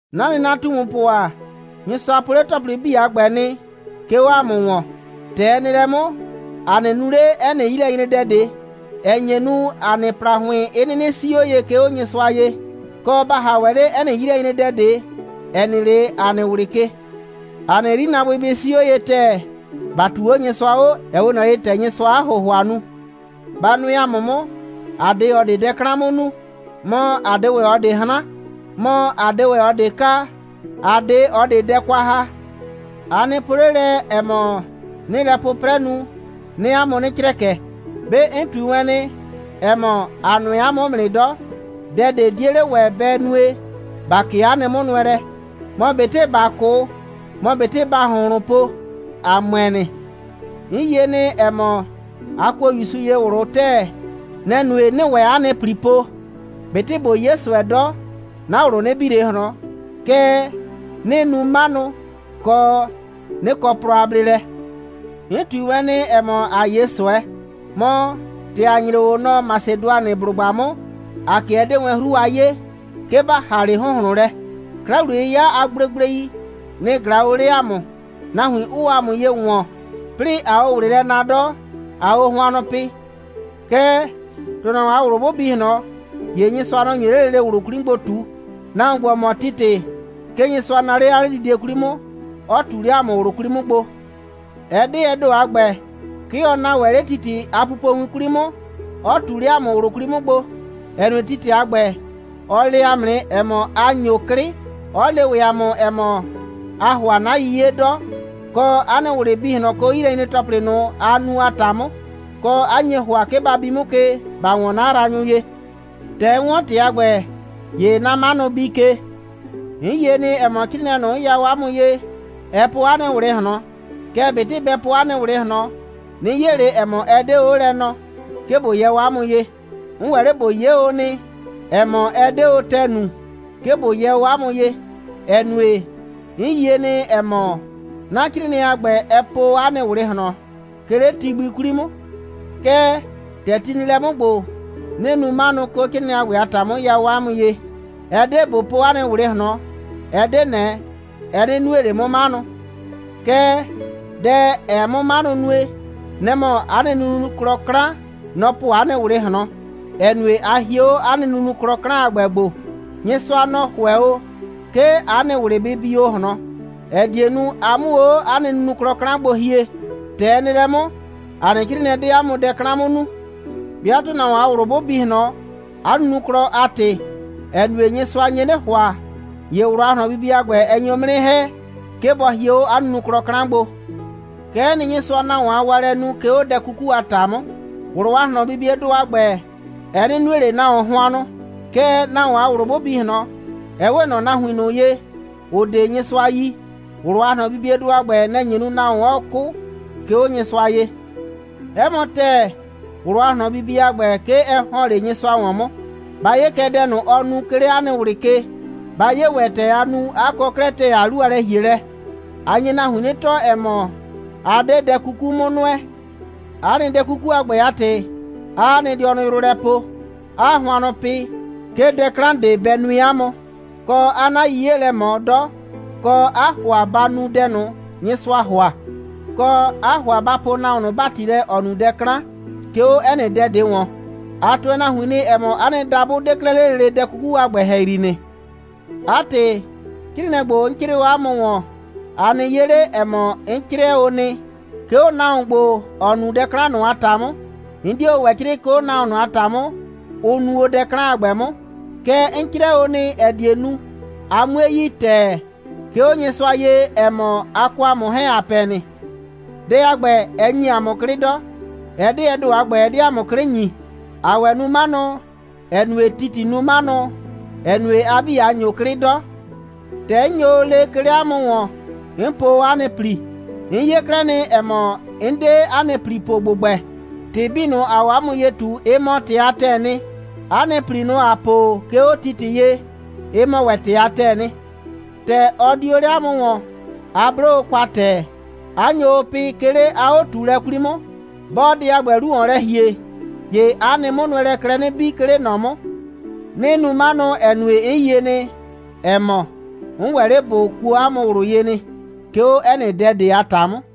'Na nɩnatumupʋ ‑a, Nyɩsʋa po 'le ‑tɔplɩ 'bii a ‑gbɛ nɩ, 'ke 'o ‑a mʋ ‑wɔn. ‑Tɛ ɛ nɩ lɛ 'mʋ, ‑a 'nɩ nu 'le 'ɛ nɩ 'yilɛnyredɛ ꞊de, ‑ɛ nye nu, ‑a nɩ ‑plahʋɩn 'ɩ 'nɩnɩ 'sii 'o ye, 'ke 'o Nyɩsʋa ye, kɔ, ‑ba ‑ha ‑wɛ 'le 'ɛ nɩ 'yilɛnyredɛ ꞊de, ‑ɛ nɩ 'le ‑a nɩ ꞊wlɩ ke. ‑A nɩ 'yrinaabʋɩ bɩ 'sii 'o ye ‑tɛɛ, ‑ba ꞊tuu 'o Nyɩsʋa 'o, ‑ɛ 'we ꞊nɔ ye, ‑tɛ Nyɩsʋaa 'a ‑hʋhʋa nu. Ba nʋɛ ‑a mʋ 'mʋ. ‑A 'de ꞊ɔ ꞊de dɛ 'klan 'mʋ nu. Mɔ, ‑a 'de ‑wɛ ꞊ɔ ꞊de 'hran. Mɔ, ‑a 'de ‑wɛ ꞊ɔ ꞊de kaa, ‑a 'de ꞊ɔ ꞊de dɛ kwa ‑ha. A nɩ po 'le lɛ, ‑ɛ mɔ, 'nɩɩ lɛ 'pʋprɛ nu, 'nɩɩ 'a mʋ 'nɩ crɛkɛ. 'Be 'n ꞊tui wɛn nɩ, ‑ɛ mɔ, ‑a nʋɛ 'a mʋ 'mʋ nɩ 'dɔ. Dɛ ꞊de 'die 'le ‑wɛ bɛ nue, ‑ba 'kee 'a nɩ 'mʋnʋɛlɛ. Mɔ ꞊betɩ ‑ba 'kʋ, mɔ ꞊betɩ ‑baa ‑hʋnhlʋn po, ‑a ‑mʋɛ nɩ. 'N yie nɩ, ‑ɛ mɔ, a kuo ‑Yusu ye ꞊wlʋ ‑tɛɛ. Nɛ‑ nue, 'nɩɩ ‑wɛ 'a nɩ ‑pli po. ꞊Betɩ ꞊bo 'ye ꞊sʋɛ 'dɔ, 'na ꞊wlʋ 'nɩ bi ꞊le ꞊hlɔn. Kɛɛ, 'nɩɩ nu 'manʋ, kɔ, 'nɩ kɔ plɔ a bleelɛ. 'N ꞊tui wɛn nɩ, ‑ɛ mɔ, ‑a 'ye ꞊sʋɛ. Mɔ, ‑tɛ ‑a nyre o nɔ Masɩdʋanɩblʋgba 'mʋ, ‑a 'kɩɛ 'dee wɛn 'hru a 'yee, 'ke ‑ba ‑ha 'le ‑hʋnhlʋn lɛ. 'Kla‑wliye'yɩya a gblegblei, nɩ‑ ꞊glaa o 'le ‑a mʋ, nahuin 'ʋʋ o ‑a mʋ ye ‑wɔn, 'plɩɩ ꞊aa o ꞊wlɩ lɛ naa 'dɔ, ꞊aa o hʋannʋ pɩ. Kɛɛ, ‑tʋnahuon a ꞊wlʋ 'bʋ bi ꞊hlɔn, ‑ye Nyɩsʋa, nɔ‑ nyo 'le lele ꞊wlʋ 'kwli 'mʋ gbo ꞊tu. Nahuon ‑gbo, ‑ɔ mɔ Titɩ, 'ke Nyɩsʋa naa 'le 'a 'ledidie 'kwli 'mʋ, 'ɔ ꞊tu 'le ‑a mʋ ꞊wlʋ 'kwli 'mʋ gbo. Ɛ 'de ɛ ‑do a ‑gbɛ. 'Ke ɔ naa ‑wɛ 'le Titɩ a pupowin 'kwli 'mʋ, 'ɔ ꞊tu 'le ‑a mʋ ꞊wlʋ 'kwli 'mʋ gbo, ‑ɛ nue, Titɩ a ‑gbɛ, ɔ le ‑a mʋ nɩ, ‑ɛ mɔ, a ‑nyo 'klɩ, 'ɔ le ‑wɛ ‑a mʋ, ‑ɛ mɔ, aa ‑hʋa 'na 'yiye 'dɔ, kɔ, 'a nɩ ꞊wlɩ bi ꞊hlɔn, 'ke 'o 'yilɛnyre‑tɔplɩ ꞊nʋ, a nu a ‑ta 'mʋ, kɔ, 'a nye ‑hʋa, 'ke ba bi 'mʋ ke, ‑ba ‑wɔn 'na yraanyʋ ye. ‑Tɛ 'n 'wɔn ‑tɩ a ‑gbɛ, ‑ye 'na 'manʋ bii ke. 'N yie nɩ, ‑ɛ mɔ, 'crɩɩnɩɛ ꞊nʋ, 'n ya o 'a mʋ ye, ɛ po 'a nɩ ꞊wlɩ ꞊hlɔn. Kɛɛ, ꞊betɩ bɛ po 'a nɩ ꞊wlɩ ꞊hlɔn, 'nɩ 'ye ꞊le, ‑ɛ mɔ, ɛ 'de 'o lɛ nɔɔ, 'ke ꞊bo yɛ o 'a mʋ ye. 'N ‑wɛ 'le ꞊bo 'ye o nɩ, ‑ɛ mɔ, ɛ 'de o ‑tɛɛ nu, 'ke ꞊bo yɛ o 'a mʋ ye, ‑ɛ nue, 'n yie nɩ, ‑ɛ mɔ, 'na 'crɩɩnɩɛ a ‑gbɛ, ɛ po o 'a nɩ ꞊wlɩ ꞊hlɔn, 'ke 'le ti gbi 'kwli 'mʋ. Kɛɛ, ‑tɛ ti nɩ lɛ 'mʋ ‑gbo, 'nɩɩ nu 'manʋ, 'ke 'o 'crɩɩnɩɛ a ‑gbɛ a ‑ta 'mʋ, 'n ya o 'a mʋ ye. Ɛ 'de ꞊bo po 'a nɩ ꞊wlɩ ꞊hlɔn, ɛ 'de ꞊nɛ, ɛ 'nɩ nue ꞊le 'mʋ 'manʋ. Kɛɛ, dɛ, ‑ɛɛ 'mʋ 'manʋ nue, nɛ‑ mɔ 'a nɩ nunuklɔ 'klan, nɔ‑ ‑bɔ po 'a nɩ ꞊wlɩ ꞊hlɔn, 'ɛ nue, 'a hie 'o 'a nɩ nunuklɔ 'klan a ‑gbɛ gbo. Nyɩsʋa, nɔ‑ ‑hʋɛ o, 'ke 'a nɩ ꞊wlɩ bɩ bi o ꞊hlɔn, ‑ɛ die nu, a 'mʋ o 'o 'a nɩ nunuklɔ 'klan gbo hie. ‑Tɛ ɛ nɩ lɛ 'mʋ, ‑a nɩ 'crɩɩnɩɛ 'de 'a mʋ dɛ 'klan 'mʋ nu. 'Bɩa ‑tʋnahuon a ꞊wlʋ 'bʋ bi ꞊hlɔn, 'a nunuklɔ a ‑tɩ, ‑ɛ nue, Nyɩsʋa nye 'nɩ ‑hʋa, ‑ye ꞊wlʋ a ꞊hlɔnbibie a ‑gbɛ, ɛ nyo 'mʋ 'nɩ ‑hɛ, 'ke bɔ hie 'o 'a nunuklɔ 'klan gbo. Kɛ'ɛ nɩ, Nyɩsʋaa nahuon a waalɛ nu, 'ke 'o dɛ 'kuku a ‑ta 'mʋ. ꞊Wlʋ a ꞊hlɔnbibiedʋ a ‑gbɛ, ɛ 'nɩ nue ꞊le nahuon hʋannʋ. Kɛɛ, nahuon a ꞊wlʋ 'bʋ bi ꞊hlɔn, ‑ɛ 'we ꞊nɔ nahuin ꞊nʋ ye, ‑ʋ 'de Nyɩsʋa yi, ꞊wlʋ a ꞊hlɔnbibiedʋ a ‑gbɛ, nɛ‑ nye nu, nahuon 'ɔɔ 'kʋ, 'ke 'o Nyɩsʋa ye. 'Ɛ mɔ ‑tɛɛ, ꞊wlʋ a ꞊hlɔnbibie a ‑gbɛ, 'ke ɛ ‑hɔn 'le Nyɩsʋa ‑wɔn 'mʋ. Ba 'ye kɛ dɛ ꞊nʋ, ɔ nu, 'ke 'le 'a nɩ ꞊wlɩ ke. Ba 'ye ‑wɛ, ‑tɛ a nu, 'a kɔ 'klɛɛ ‑tɛɛ a 'lu a lɛ‑hielɛ. A nye nahuin 'nɩ tɔɔ, ‑ɛ mɔ, a 'de dɛ 'kuku 'mʋ nʋɛ. 'A nɩ dɛ 'kuku a ‑gbɛ a ‑tɩ, 'aa 'a nɩ dɩɔnʋ yrʋ lɛ poo, 'aa hʋannʋ pɩ, 'ke dɛ 'klan ꞊de bɛ nue 'a mʋ, kɔ, 'aa 'na 'yiye lɛ ꞊mɔ 'dɔ, kɔ, 'aa ‑hʋa ba nu dɛ ꞊nʋ, Nyɩsʋaa ‑hʋa, kɔ, 'aa ‑hʋa ba poo nahuon ꞊nʋ ‑bati lɛ, ‑ɔ nu dɛ 'klan. 'Ke 'o 'ɛ nɩ dɛ ꞊de ‑wɔn, a tʋɛ nahuin nɩ, ‑ɛ mɔ, 'a nɩ dabʋ 'de 'klɛɛ 'le lele dɛ 'kuku a ‑gbɛ ‑hɛyri nɩ. 'A ‑tɩ, 'crɩɩnɩɛ ‑gbo, 'n 'crɩɩ o 'a mʋ ‑wɔn, a nɩ 'ye 'le, ‑ɛ mɔ, 'n 'crɩɛ o nɩ, 'ke 'o nahuon ‑gbo, ‑ɔ nu dɛ 'klan ꞊nʋ a ‑ta 'mʋ. 'N 'die o ‑wɛ 'crɩɩ, 'ke 'o nahuon ꞊nʋ a ‑ta 'mʋ, ʋ nu o dɛ 'klan a ‑gbɛ 'mʋ. Kɛɛ, 'n 'crɩɛ o nɩ, ‑ɛ die nu, a 'mue yi ‑tɛɛ, 'ke 'o Nyɩsʋa ye, ‑ɛ mɔ, a kɔ ‑a mʋ 'hɛɛn, ‑a pɛ nɩ. Dɛ a ‑gbɛ, ɛ ‑nyi ‑a mʋ 'klɩ 'dɔ. Ɛ 'de ɛ ‑do a ‑gbɛ, ɛ 'de ‑a mʋ 'klɩ ‑nyi. ‑Aa ‑wɛ nu 'manʋ, ‑ɛ nue, Titɩ nu 'manʋ, ‑ɛ nue, a 'bii, a ‑nyo 'klɩ 'dɔ. ‑Tɛ 'n nyo o lee, 'ke 'le 'a mʋ ‑wɔn, 'n po o 'a nɩ ‑pli. 'N 'ye 'klɛɛ nɩ, ‑ɛ mɔ, 'n 'de 'a nɩ ‑pli po ‑gbʋgbɛ. ‑Tɩ 'bii ꞊nʋ, ‑aa o 'a mʋ ye ꞊tu, ɩ mɔ ‑tɩ a ‑tɛɛ nɩ. 'A nɩ ‑pli ꞊nʋ, ‑a po o, 'ke 'o Titɩ ye, ɩ mɔ ‑wɛ ‑tɩ a ‑tɛɛ nɩ. ‑Tɛ ɔ di o 'le 'a mʋ ‑wɔn, a 'blo o kwa ‑tɛɛ, 'a nyo o pɩ, 'ke 'le 'a 'o꞊tuulɛ 'kwli 'mʋ. 'Bɔɔ dɛ a ‑gbɛ 'lu ‑wɔn lɛ ‑hie, ‑ye 'a nɩ 'mʋnʋɛlɛɛ klɛ 'nɩ bii, 'ke 'le ꞊nɔ 'mʋ. 'Nɩɩ nu 'manʋ, ‑ɛ nue, 'n yie nɩ, ‑ɛ mɔ, 'n ‑wɛ 'le ꞊bo kuo 'a mʋ ꞊wlʋ ye nɩ, 'ke 'o 'ɛ nɩ dɛ ꞊de a ‑ta 'mʋ.